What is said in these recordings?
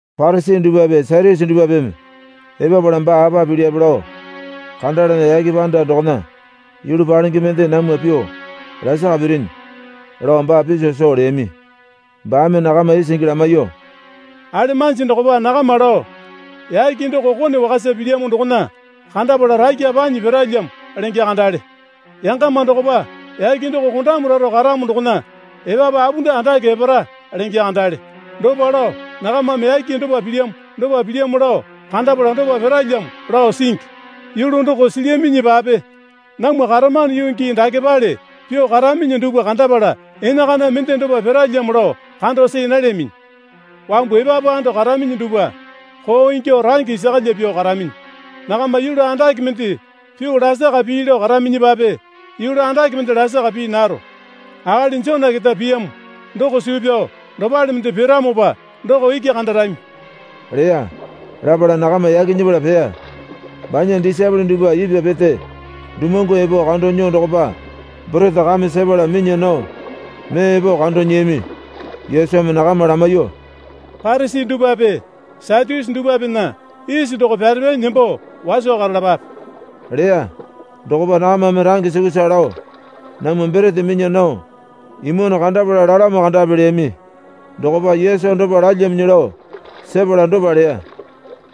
Parisi dupwape Satyusi dupwapeme epapala baa apa pilyape lao kandalana, yake panda dokona yulu palenge mende namwa pyuo lasaka pirinyi, lao baa piso soo leyami. Baame nakama isingi lamaiyuo, Alemanji dokopa nakama lao, Yake doko kone wakasa pilyamo dokona kandapala rakya panyi piralyamo lenge kandale. Yangama dokopa, Yake doko kondamu raro karamo dokona epapu apunda andake epara, lenge kandale. Dopa lao nakamame yake dopa pilyamo dopa pilyamo lao kandapala dopa piralyamo lao singi. Yulu doko silyaminyipape namwa karamano yuu gii dakepale pyuo karaminyi dupwa kandapala enakana mende dopa piralyamo lao kando see nalyaminyi. Wambu epapu ando karaminyi dupwa koo ingyuo range isakalya pyuo karaminyi. Nakama yulu andake mende pyuo lasaka pii lao karaminyipape yulu andake mende lasaka pii naro. Akali Jona keta piyamo doko suu pyao dopale mende piramopa doko iki kandarami, leya. Lapala nakama yaki nyepala peya. Banya disaepole dupwa ipwa pete dumuwangu epo kando nyuo dokopa borete kame sepala minya nao mee epo kando nyiyami. Yesumi nakama lamaiyuo, Parisi dupwape Satyusi dupwapena isi doko pyarepanyi nembo waso karalapape, leya. Dokopa nakamame range sukusa lao, Namwa borete minya nao imwano kandapala lalamo kandapi, leyami. Dokopa Yesu dopa lalyaminyi lao sepala dopa leya.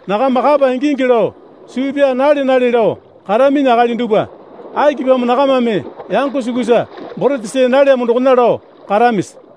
Nakama kapa ingingi lao suu pyaa nale nale lao karaminyi akali dupwa, akipamo nakamame, yango sukusa borete see nalyamo dokona lao karamisi?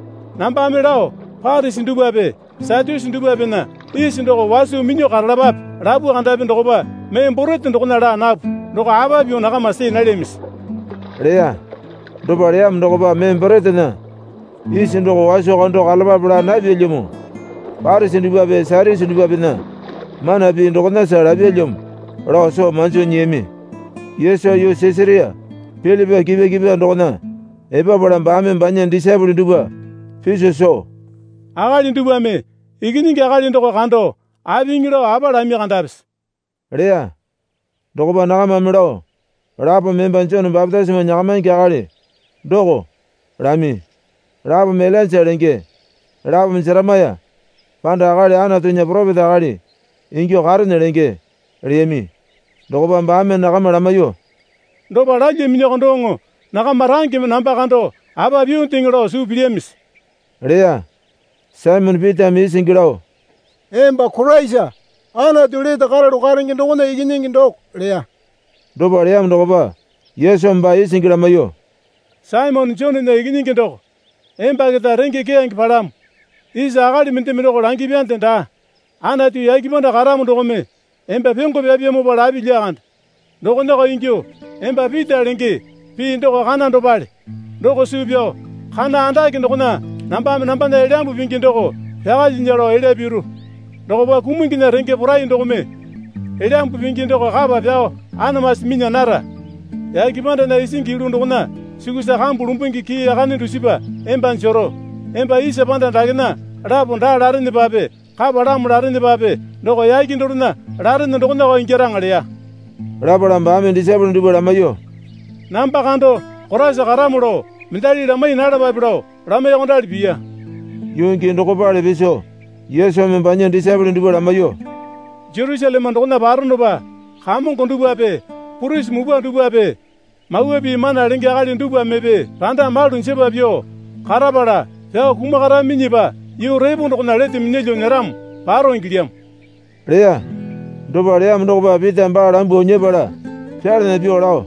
Nambame lao Parisi dupwape Satyusi dupwapena isi doko waso minyuo karalapape, lapu kandapi dokopa mee borete dokona laa napu doko apa pyuo nakama see nalyamisi? leya. Dopa leyamo dokopa mee boretena isi doko waso kando karalapape laa napyalyamo. Parisi dupwape Satyusi dupwapena mana pii dokonasa lapyalyamo lao soo manjo nyiyami. Yesu yuu Sisaria Pilipai kipwa kipwa dokona epapala baame banya disaepole dupwa piso soo, Akali dupwame Ikinyingi Akali doko kando apiŋi lao apa lami kandapisi? leya. Dokopa nakamame lao, Lapome emba Jone bapitisimo nyakamaingi akali doko, lami. Lapome Ilainja lenge, lapome Jeremaya, panda akali Anatunya poropeta akali ingyuo karene lenge, leyami. Dokopa baame nakama lamaiyuo, Dopa lalyaminyiko doŋo nakama rangeme namba kando apa pyuondeŋe lao suu pilyamisi? leya. Saimone Pitame isingi lao, Emba Koraisa, Anatu lete karalu karenge dokona Ikinyingi doko, leya. Dopa leyamo dokopa Yesumi baa isingi lamaiyuo, Saimone Jonena Ikinyingi doko, emba keta renge keyange palamo. Isa akali mendeme doko langyapyande daa. Anatu yake panda karamo dokome emba pyongo pyapyamopa lapi lyakande. Dokonako ingyuo emba Pita lenge (pii doko kana dopale) doko suu pyao kana andake dokona nambame nambana Elyambu Pingi doko pyakalyinya lao elya piru. Dokopa kumunginya renge porai dokome Elyambu Pingi doko kapa pyao amasu minya nara. Yake pandana isingi yulu dokona sukusa kambu lumbungi kii yakane dusipa emba jero. Emba isa panda dakena lapo daa larenepape kapalamo larenepape doko yake dorena larene dokonako ingyaraŋa leya. Lapala baame disaepole dupwa lamaiyuo, Namba kando Koraisa karamo lao mendali lamai nalapape lao lamaiyuokondali piya. Yuu gii dokopale piso Yesumi banya disaepole dupwa lamaiyuo, Jerusaleme dokona paronopa kamongo dupwape purisi mupwa dupwape Mawa Pii mana lenge akali dupwamepe randa malu jepa pyuo karapala pyao kumakaraminyipa yuu repo dokona lete minyalyuo nyeramo paro ingilyamo, leya. Dopa leyamo dokopa Pitame baa lambuo nyepala pyalana pyuo lao,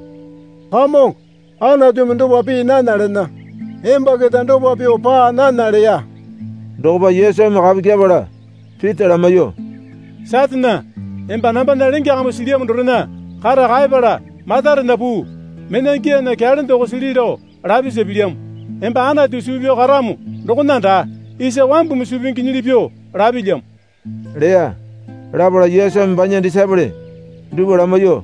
Kamongo, Anatumi dopa pii nana lena. Emba keta dopa pyuo paa nana, leya. Dokopa Yesumi kapu kyepala Pita lamaiyuo, Satane, emba nambana lenge kambu silyamo dorena kata kaepala matarena puu. Mena gyaana kyalende oko sili lao lapisa pilyamo. Emba Anatu suu pyao karamo dokona daa. Isa wambumi suu pinginyili pyuo lapilyamo leya. Lapala Yesumi banya disaepole dupwa lamaiyuo,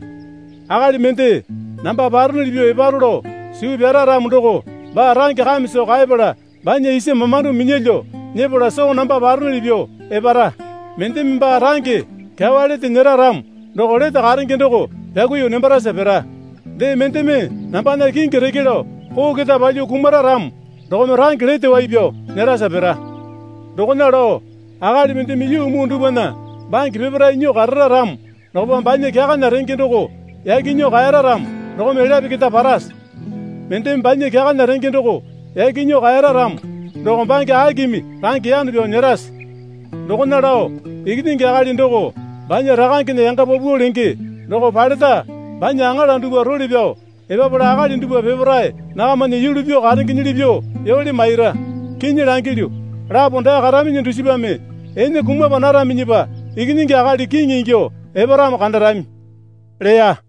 Akali mende namba paronuli pyuo eparo lao suu pyara ramo doko baa range kame soo kaepala banya isa mamando minyalyuo nyepala soo namba paronuli pyuo epara. Mendeme baa range kyawa lete nyera ramo doko lete karenge doko pyakuiyuo nembarasa pira. Dee mendeme nambana kingi reke lao koo keta palyuo kumara ramo dokome range lete wai pyao nyerasa pira. Dokona lao akali mendeme yuu muu dupwana bange peparae nyuo karara ramo dokopa banya kyakana renge doko yaki nyuo kaeyara ramo dokome elyape keta parase? Mendeme banya kyakana renge doko yaki nyuo kaera ramo doko bange akimi range yano pyao nyerase? Dokona lao Ikinyingi Akali doko banya Rakangena yanga paupau lenge doko paleta banya aŋala dupwa role pyao epapala akali dupwa peparae nakamana yulu pyuo karengenyili pyuo yole maira. Kinyi langilyu, lapo dae karaminyi dusipame ene kumapa naraminyipa Ikinyingi Akali kiŋi ingyuo eparamo kandarami, leya.